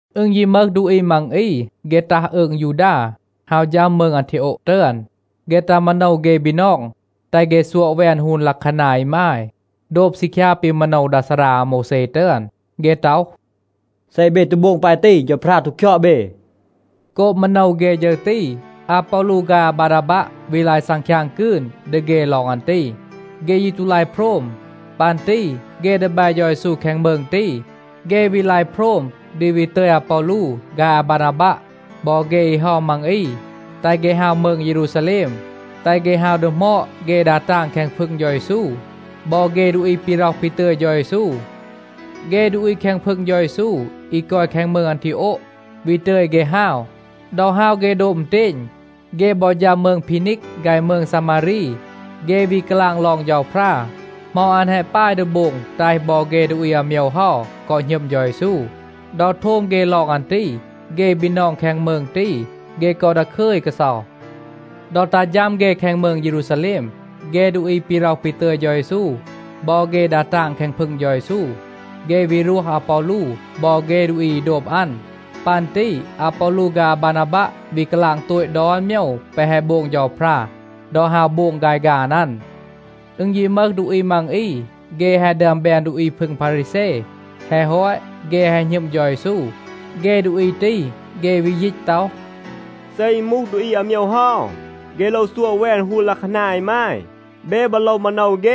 อึณ ยี มึห ดูอี มัง อี, เฆ ตัห อืง ยูดา, ฮาว ฌัม มืง อันทีโอะ ตึอน. เฆ ตัห มาโนว เฆ บีนอง, แตห เฆ ซัวะ แวน ฮูน ลัะคานา อีมาย, โดบ ซีคยา ปี มาโนว ดา ซารา อาโมวแซ ตึอน. เฆ ต็อห, “เซ เบ ตู โบง ปาย ตี, เฌาพรา ตู คยอด เบ.” โกบ มาโนว เฆ ฌึร ตี, อาปอลู ฆาย อาบานาบัะ วี ลาย ซังคยาง กืน ดี เฆ ลอง อัน ตี. เฆ ยี ตู ลาย โพรม. ปัน ตี เฆ ดีแบ เฌา เยซู แคง มืง ตี, เฆ วี ลาย โพรม ดี วี ตึย อาปอลู ฆาย อาบานาบัะ บอ เฆ อี เฮา มัง อี, แตห เฆ ฮาว มืง เยรูซาแลม, แตห เฆ ฮาว ดีหมอด เฆ ดา ตาง แคง พึง เฌา เยซู บอ เฆ ดูอี ปี ร็อห ปี ตึย เฌา เยซู. เฆ ดูอี แคง พึง เฌา เยซู อี กอย แคง มืง อันทีโอะ, วี ตึย เฆ ฮาว. ดอ ฮาว เฆ โดบ อึณเตณ, เฆ บอ ฌัม มืง พีนีก ฆาย มืง ซามารี. เฆ วี กาลาง ลอง เฌาพรา, เหมา อัน แฮะ ปาย ดี โบง แตห บอ เฆ ดูอี อาโมยว เฮา กอ หณึม เฌา เยซู. ดอ โทม เฆ ลอง อัน ตี, เฆ บีนอง แคง มืง ตี, เฆ กอ ดาคึย กาเซา. ดอ ตัห ฌัม เฆ แคง มืง เยรูซาแลม, เฆ ดูอี ปี ร็อห ปี ตึย เฌา เยซู, บอ เฆ ดา ตาง แคง พึง เฌา เยซู, เฆ วี รวห อาปอลู บอ เฆ ดูอี อี โดบ อัน. ปัน ตี อาปอลู ฆาย อาบานาบัะ วี กาลาง โตต ดอน โมยว แปะ แฮะ โบง เฌาพรา ดอ ฮาว โบง ฆาย ฆาน อัน. อึณ ยี มึห ดูอี มัง อี, เฆ แฮะ ดึอม แบน ดูอี พึง พารีแซ. แฮะ ฮอต, เฆ แฮะ หณึม เฌา เยซู. เฆ ดูอี ตี, เฆ วี ยีต ต็อห, “เซ อึณ มูห ดูอี อาโมยว เฮา, เฆ โลว ซัวะ แวน ฮูน ลัะคานา อีมาย. เบ บอ โลว มาโนว เฆ,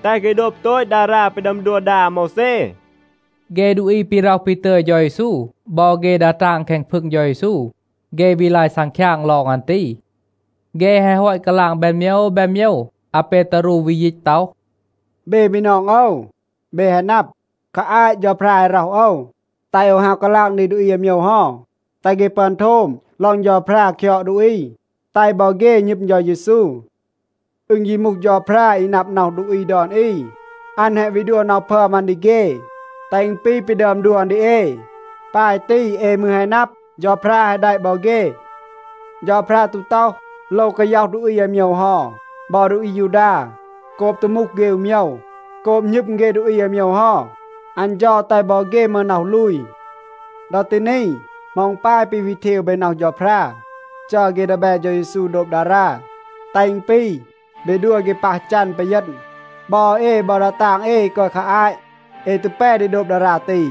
แตห เฆ โดบ โตต ดารา ปี ดึอม ดัว ดา อาโมวแซ.” เฆ ดูอี ปี ร็อห ปี ตึย เฌา เยซู บอ เฆ ดา ตาง แคง พึง เฌา เยซู, เฆ วี ลาย ซังคยาง ลอง อัน ตี. เฆ แฮะ ฮอต กาลาง แบน โมยว แบน โมยว, อาเปตารู วี ยีต ต็อห, “เบ บีนอง โอว, เบ แฮะ นับ, คา อาต เฌาพรา แฮะ ร็อห โอว, แตห โอว ฮาว กาลาง ดี ดูอี อาโมยว เฮา, แตห เฆ ปึอน โทม ลอง เฌาพรา คยอด ดูอี, แตห บอ เฆ หณึม เฌา เยซู. อึณ ยี มูห เฌาพรา อี นับ น็อห ดูอี ดอน อี, อัน แฮะ วี ดัว น็อห พึอม อัน ดี เฆ, แตห อึณ ปี ปี ดึอม ดัว อัน ดี เอ. ปาย ตี, เอ มืร แฮะ นับ, เฌาพรา แฮะ แดะ บอ เฆ. เฌาพรา ตู ต็อห, โลว กาย็อห ดูอี อาโมยว เฮา บอ ดูอี อายูดา โกบ ตู มูห เฆ อู โมยว. โกบ หณึม เฆ ดูอี อาโมยว เฮา, อัน เฌา แตห บอ เฆ มึห น็อห ลูย. ดอ ตี นี, เหมา อึณ ปาย ปี วี เทว เบ น็อห เฌาพรา, จัร เฆ ดีแบ เฌา เยซู โดบ ดารา, แตห อึณ ปี, เบ ดัว เฆ ปัห จัน ปีเยณ. บอ เอ บอ ดา ตาง เอ อี กอย คา อาต เอ ตู แป ดี โดบ ดารา ตี.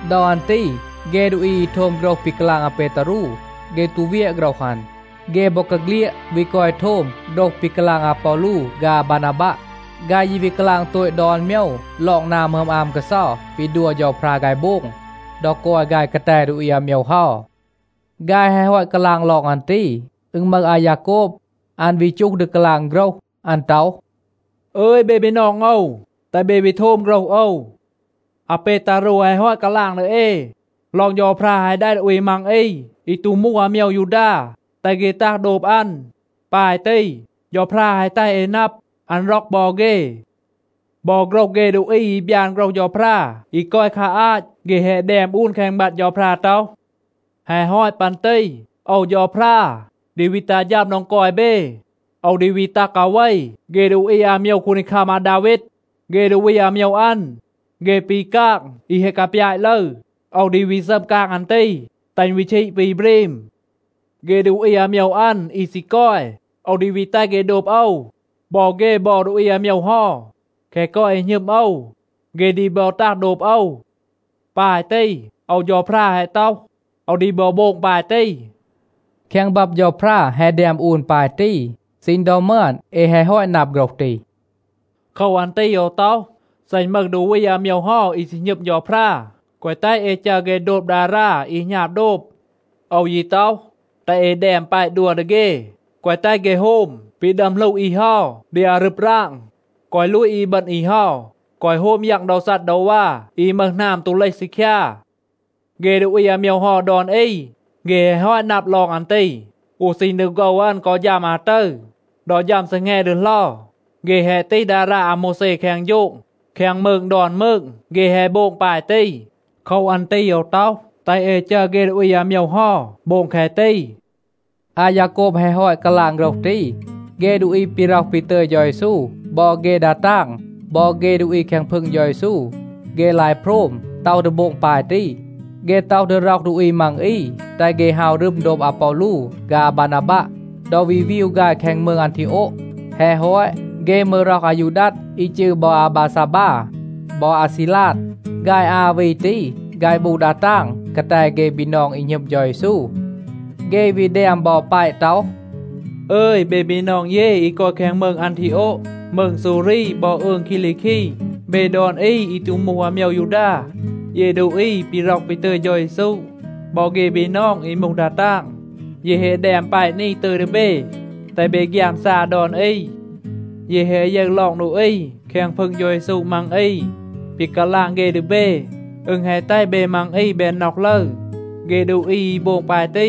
ดอ อัน ตี เฆ ดูอี อี โทม โฆรห ปี กาลาง อาเปตารู, เฆ ตู เวียะ โฆรห อัน. เฆ บอกาเฆลียด วี กอย โทม โฆรห ปี กาลาง อาปอลู ฆาย อาบานาบัะ. ฆาย ยี วี กาลาง โตต ดอน โมยว ลอง นา หมึอม อาม กาเซา ปี ดัว เฌาพรา ฆาย โบง ดอ กอย ฆาย กาแต ดูอี อาโมยว เฮา. ฆาย แฮะ ฮอต กาลาง ลอง อัน ตี, อึณ มึห อายาโกบ, อัน วี จูห ดี กาลาง โฆรห. อัน ต็อห, “อึย เบ บีนอง โอว, แตห เบ วี โทม โฆรห โอว. อาเปตารู แฮะ ฮอต กาลาง ดี เอ ลอง เฌาพรา แฮะ แดะ ดูอี มัง อี อี ตู มูห อาโมยว ยูดา, แตห เฆ ตัห โดบ อัน. ปาย ตี เฌาพรา แฮะ แตห เอ นับ, อัน ร็อก บอ เฆ. บอ โฆรห เฆ ดูอี อี บยาน โฆรห เฌาพรา อี กอย คา อาต เฆ แฮะ แดม อูน แคง บับ เฌาพรา ต็อห, ‘แฮะ ฮอต ปัน ตี โอว เฌาพรา ดี วี ตัห ฌัม โดง กอย เบ. โอว ดี วี ตัห กาเว เฆ ดูอี อาโมยว คูนดีคัม อาดาวีด. เฆ ดูอี อาโมยว อัน, เฆ ปี กาง อี แฮะ กาปยาต ลึร. โอว ดี วี ซัม กาง อัน ตี, แตห อึณ วี ชีด ปี บรีม. เฆ ดูอี อาโมยว อัน, อี ซี กอย, โอว ดี วี แตห เฆ โดบ โอว. บอ เฆ บอ ดูอี อาโมยว เฮา, แคะ กอย อี หณึม โอว, เฆ ดี บอ ตัห โดบ โอว. ปาย ตี โอว เฌาพรา แฮะ ต็อห. โอว ดี บอ โบง ปาย ตี.’ แคง บับ เฌาพรา แฮะ แดม อูน ปาย ตี. ซีณ ดอ มึอน เอ แฮะ ฮอต นับ โฆรห ตี. โคว อัน ตี โอว ต็อห, เซ อึณ มึห ดูอี อาโมยว เฮา อี ซี หณึม เฌาพรา, แกวะ แตห เอ จัร เฆ โดบ ดารา อี หณาบ โดบ. โอว ยี ต็อห, แตห เอ แดม แปะ ดัว ดี เฆ, แกวะ แตห เฆ โฮม ปี ดึอม หลู อี เฮา ดี อารึบ ราง. แกวะ ลูต อีบึณ อี เฮา, แกวะ โฮม ยัง โดว ซัดดาวา อี มึห หนาม ตู เลห ซีคยา. เฆ ดูอี อาโมยว เฮา ดอน อี, เฆ แฮะ ฮอต นับ ลอง อัน ตี. อู ซีณ ดอ โฆว อัน กอ ฌัม อาตึร, ดอ ฌัม ซีแง ดีเหลา, เฆ แฮะ ตีห ดารา อาโมวแซ แคง โฌง. แคง มืง ดอน มืง เฆ แฮะ โบง ปาย ตี. โคว อัน ตี โอว ต็อห, แตห เอ จัร เฆ ดูอี อาโมยว เฮา โบง แคะ ตี.” อายาโกบ แฮะ ฮอต กาลาง โฆรห ตี, เฆ ดูอี ปี ร็อห ปี ตึย เฌา เยซู บอ เฆ ดา ตาง บอ เฆ ดูอี แคง พึง เฌา เยซู, เฆ ลาย โพรม, ต็อห ดี โบง ปาย ตี. เฆ ต็อห ดี ร็อห ดูอี มัง อี, แตห เฆ ฮาว รึม โดบ อาปอลู ฆาย อาบานาบัะ ดอ วี วีว ฆาย แคง มืง อันทีโอะ. แฮะ ฮอต, เฆ มืร ร็อห อายูดัด อี จืร บอ อาบาซาบา บอ อาซีลาด. ฆาย อา วี ตี, ฆาย มูห ดา ตาง กาแต เฆ บีนอง อี หณึม เฌา เยซู. เฆ วี แดม บอ แปะ ต็อห, “อึย, เบ บีนอง เย อี กอย แคง มืง อันทีโอะ, มืง ซูรี บอ อืง คีลีคี, เบ ดอน อี อี ตู มูห อาโมยว ยูดา. เย ดูอี ปี ร็อห ปี ตึย เฌา เยซู, บอ เฆ บีนอง อี มูห ดา ตาง, เย แฮะ แดม แปะ นี ตึย ดี เบ, แตห เบ ฆยามซา ดอน อี. เย แฮะ ยึร ลอง ดูอี แคง พึง เฌา เยซู มัง อี. ปี กาลาง เฆ ดี เบ, อึณ แฮะ แตห เบ มัง อี แบน น็อห ลึร. เฆ ดูอี อี โบง ปาย ตี,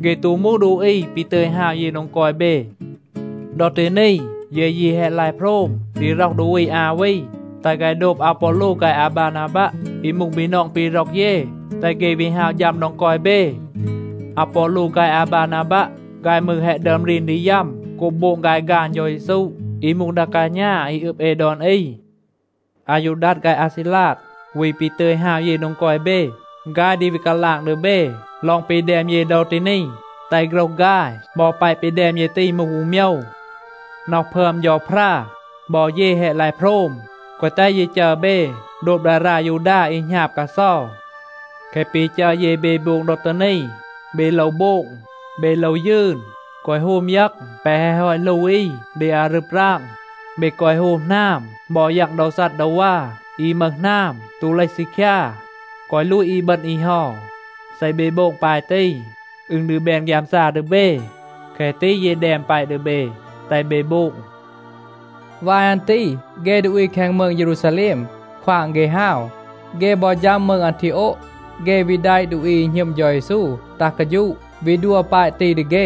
เฆ ตู มูห ดูอี ปี ตึย ฮาว เย โดง กอย เบ. ดอ ตี นี, เย ยี แฮะ ลาย โพรม ดี ร็อห ดูอี อา วี, แตห ฆาย โดบ อาปอลู ฆาย อาบานาบัะ อี มูห บีนอง ปี ร็อก เย, แตห เฆ วี ฮาว ฌัม โดง กอย เบ. อาปอลู ฆาย อาบานาบัะ, ฆาย มืร แฮะ ดึอม รีน ดี ยัม โกบ โบง ฆาย ฆาน เฌา เยซู, อี มูห ดา กาณา อี อึบ เอ ดอน อี. อายูดัด ฆาย อาซีลาด, วี ปี ตึย ฮาว เย โดง กอย เบ, ฆาย ดี วี กาลาง ดี เบ ลอง ปี แดม เย ดอ ตี นี, แตห โฆรห ฆาย บอ แปะ ปี แดม เย ตี มูห อู โมยว. น็อห พึอม เฌาพรา บอ เย แฮะ ลาย โพรม, แกวะ แตห เย จัร เบ โดบ ดารา ยูดา อี หณาบ กาเซา. แคะ ปี จัร เย เบ โบง ดอ ตี นี, เบ โลว โบง. เบ โลว ยืน แกวะ โฮม ยัง แปะ แฮะ ฮอต หลู อี ดี อารึบ ราง. เบ แกวะ โฮม หนาม บอ ยัง โดว ซัดดาวา อี มึห หนาม ตู เลห ซีคยา. แกวะ ลูต อีบึณ อี เฮา. เซ เบ โบง ปาย ตี, อึณ ดี แบน ฆยามซา ดี เบ. แคะ ตี เย แดม แปะ ดี เบ, แตห เบ โบง.” วาย อัน ตี เฆ ดูอี แคง มืง เยรูซาแลม ควาง เฆ ฮาว. เฆ บอ ฌัม มืง อันทีโอะ, เฆ วี แดะ ดูอี อี หณึม เฌา เยซู ตัห กาฌูะ, วี ดัว แปะ ตี ดี เฆ.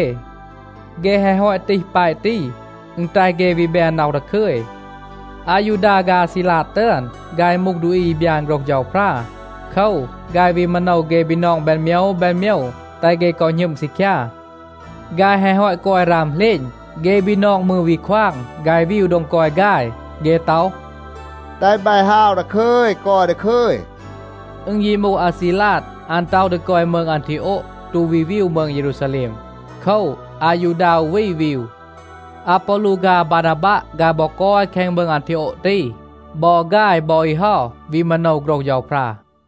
เฆ แฮะ ฮอต ตีห แปะ ตี, อึณ แตห เฆ วี แบน น็อห ดาคึย. อายูดา ฆาย อาซีลาด ตึอน, ฆาย มูห ดูอี อี บยาน โฆรห เฌาพรา. โคว, ฆาย วี มาโนว เฆ บีนอง แบน โมยว แบน โมยว, แตห เฆ กอ หณึม ซีคยา. ฆาย แฮะ ฮอต กอย ราม เหลณ, เฆ บีนอง มืร วี ควาง ฆาย วีว โดง กอย ฆาย. เฆ ต็อห, “แตห บาย ฮาว ดาคึย, กอย ดาคึย.” อึณ ยี มูห อาซีลาด, อัน ต็อห ดี กอย มืง อันทีโอะ, ตู วี วีว มืง เยรูซาแลม. โคว, อายูดา อู วี วีว. อาปอลู ฆาย อาบานาบัะ, ฆาย บอ กอย แคง มืง อันทีโอะ ตี. บอ ฆาย บอ อี เฮา วี มาโนว โฆรห เฌาพรา.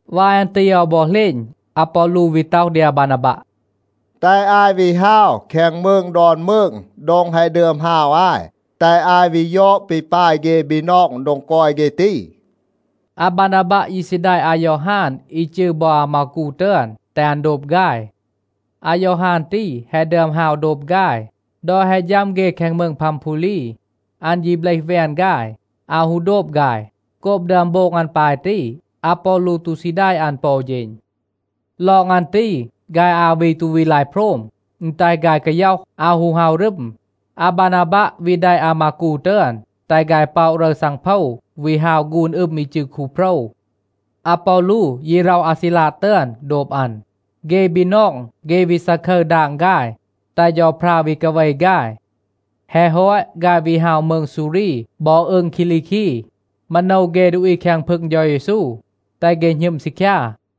วาย อัน ตี อาว บอ เหลณ, อาปอลู วี ต็อห ดี อาบานาบัะ, “แตห อาย วี ฮาว แคง มืง ดอน มืง โดง แฮะ ดึอม ฮาว อาย, แตห อาย วี ยอด ปี ปาย เฆ บีนอง โดง กอย เฆ ตี.” อาบานาบัะ ยี ซี แดะ อายอฮาน อี จืร บอ อามากู ตึอน, แตห อัน โดบ ฆาย. อายอฮาน ตี แฮะ ดึอม ฮาว โดบ ฆาย. ดอ แฮะ ฌัม เฆ แคง มืง พัมพูลี, อัน ยี เบลห แวน ฆาย, อาว ฮู โดบ ฆาย. โกบ ดึอม โบง อัน ปาย ตี, อาปอลู ตู ซี แดะ อัน ปอ อู เฌณ. ลอง อัน ตี ฆาย อา วี ตู วี ลาย โพรม. อึณ แตห ฆาย กาย็อห, อาว ฮู ฮาว รึม. อาบานาบัะ วี แดะ อามากู ตึอน, แตห ฆาย ป็อะ รึร ซังโพว วี ฮาว ฆูน อึม อี จืร คูโพรว. อาปอลู ยี ร็อห อาซีลาด ตึอน โดบ อัน. เฆ บีนอง, เฆ วี ซาคึร ดาง ฆาย, แตห เฌาพรา วี กาเว ฆาย. แฮะ ฮอต, ฆาย วี ฮาว มืง ซูรี บอ อืง คีลีคี, มาโนว เฆ ดูอี แคง พึง เฌา เยซู, แตห เฆ หณึม ซีคยา.